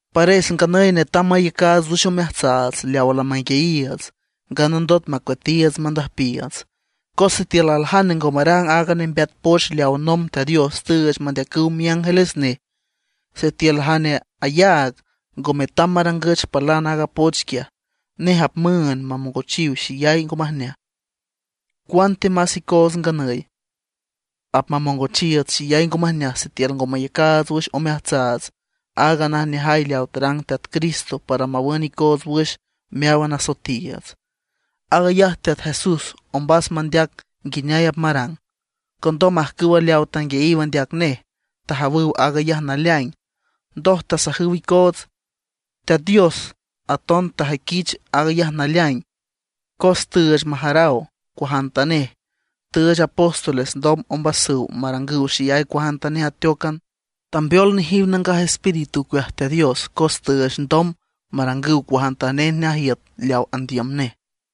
Pares nganüy netam mayacaats wüx omeajtsaats leawa lamanguiayiiüts, nganandot macueatiiüts mandüjpiiüts. Cos sitiül aljane ngo marang aaga nembeat poch leaw nomb Teat Dios tüüch mandeacüw miángeles nej, sitiül jane ayaag ngo metam marangüch palan aaga poch quiaj, nej apmüünd mamongochiw xeyay ngo majneaj. ¡Cuantemás icoots nganüy apmamongochiiüts xeyay ngo majneaj sitiül ngo mayacaats wüx omeajtsaats aaga najneajay leawa tarang Teat Cristo para mawün icoots wüx meáwan asoetiiüts! Aag ayaj Teat Jesús ombas mandeac nguineay apmarang, condom ajcüwa leawa tanguiayiw andeac nej tajawüw aag ayaj naleaing, ndoj tasajüw icoots. Teat Dios aton tajüiquich aag ayaj naleaing, cos tüüch majaraw cuajantanej; tüüch apóstoles ndom ombasüw marangüw xeyay cuajantanej ateócan. Tambeol nejiw Nangaj Espíritu ocueaj Teat Dios cos tüüch ndom marangüw cuajantanej najiüt leaw andiüm nej.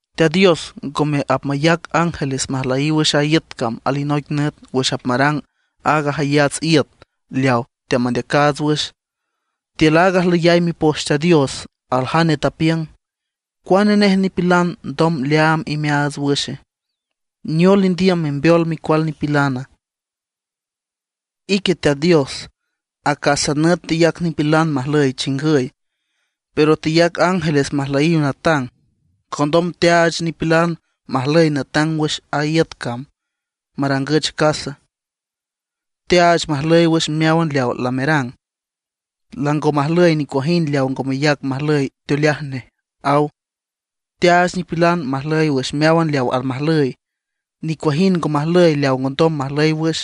Teat Dios ngome apmayac ángeles majlüyiw wüx a iüt cam alinoic nüt wüx apmarang aaga jayats iüt leawa teamandeacaats wüx. Tiül aaga ajlüyay Mipoch Teat Dios aljane tapiüng: ¿Cuane nej nipilan ndom leaam imeaats wüxe? ¿Neol indiüm membeol micual nipilana? Ique Teat Dios, acásan nüt teyac nipilan majlüy chingüy, pero teyac ángeles majlüyiw natang. Condom teaach nipilan majlüy natang wüx a iüt cam, marangüch casa; teaach majlüy wüx meáwan leaw lamerang; lango majlüy nicuajind leaw ngo meyac majlüy teoleaj nej, aw. Teaach nipilan majlüy wüx meáwan leaw almajlüy, nicuajind ngo majlüy leaw ngondom majlüy wüx.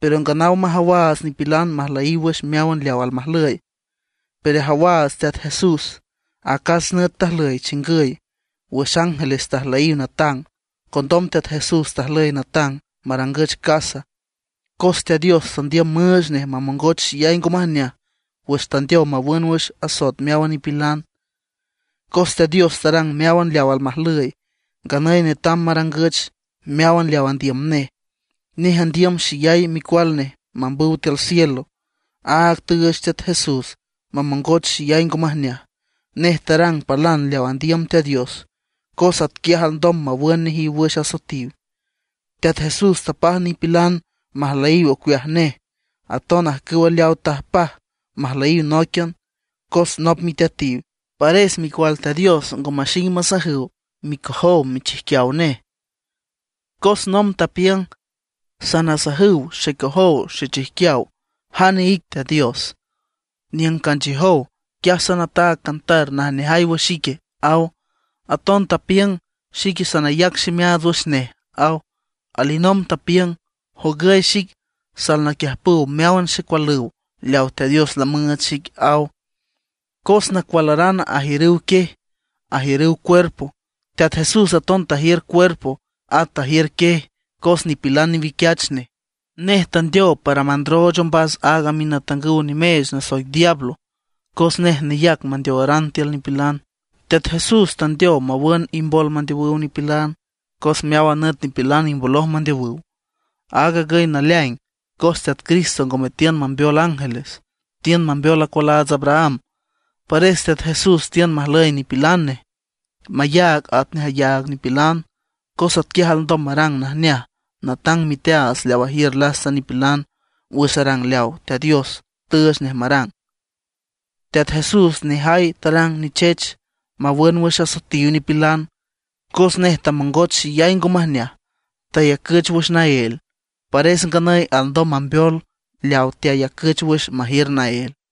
Pero nganaw majawaats nipilan majlüyiw wüx meáwan leaw almajlüy. Pero ajawaats Teat Jesús, acas nüt tajlüy chingüy, wüx ángeles tajlüyiw natang. Condom Teat Jesús tajlüy natang, marangüch casa; cos Teat Dios tandiüm müüch nej mamongoch xeyay ngo majneaj wüx tandeow mawün wüx asoet meáwan nipilan. Cos Teat Dios tarang meáwan leaw almajlüy, nganüy netam marangüch meáwan leaw andiüm nej. Nej andiüm xeyay micual nej mambüw tiül cielo, áag tüüch Teat Jesús mamongoch xeyay ngo majneaj. Nej tarang palan leaw andiüm Teat Dios, cos atquiaj alndom mawün nejiw wüx asoetiw. Teat Jesús tapaj nipilan majlüyiw ocueaj nej, aton ajcüw leawa tajpaj majlüyiw nóiquian, cos nop miteatiw; pares Micual Teat Dios ngo maxing masajüw micojow michijquiaw nej. Cos nomb tapiüng: Sanasajüw xecojow xechijquiaw jane ic Teat Dios. Niüng canchiüjow, quiaj sanataag cantar najneajay wüx ique, aw. Aton tapiüng: Xique sanayac ximeaats wüx nej, aw. Alinomb tapiüng: Jogüy xic, salnaquiüjpüw meáwan xecualüw leaw Teat Dios lamüüch xic, aw. Cos nacualaran ajiürüw quiej, ajiürüw cuerpo, Teat Jesús aton tajiür cuerpo, at tajiür quiej cos nipilan newiquiach nej. Nej tandeow para mandrooch ombas aaga minatangüw nimeech nasoic diablo, cos nej neyac mandeowaran tiül nipilan. Teat Jesús tandeow mawün imbol mandeowüw nipilan, cos meáwan nüt nipilan imboloj mandeowüw. Aag agüy naleaing, cos Teat Cristo ngome tiün mambeol ángeles, tiün mambeol acualaats Abraham. Pares Teat Jesús tiün majlüy nipilan nej, mayaag atnej ayaag nipilan, cos atquiaj alndom marang najneaj natang miteaats leaw ajiür lasta nipilan wüx arang leaw Teat Dios tüüch nej marang. Teat Jesús nejay tarang nichech, mawün wüx asoetiw nipilan. Cos nej tamongoch xeyay ngo majneaj, tayacüch wüx naél. Pares nganüy alndom mambeol leaw teayacüch wüx majiür naél.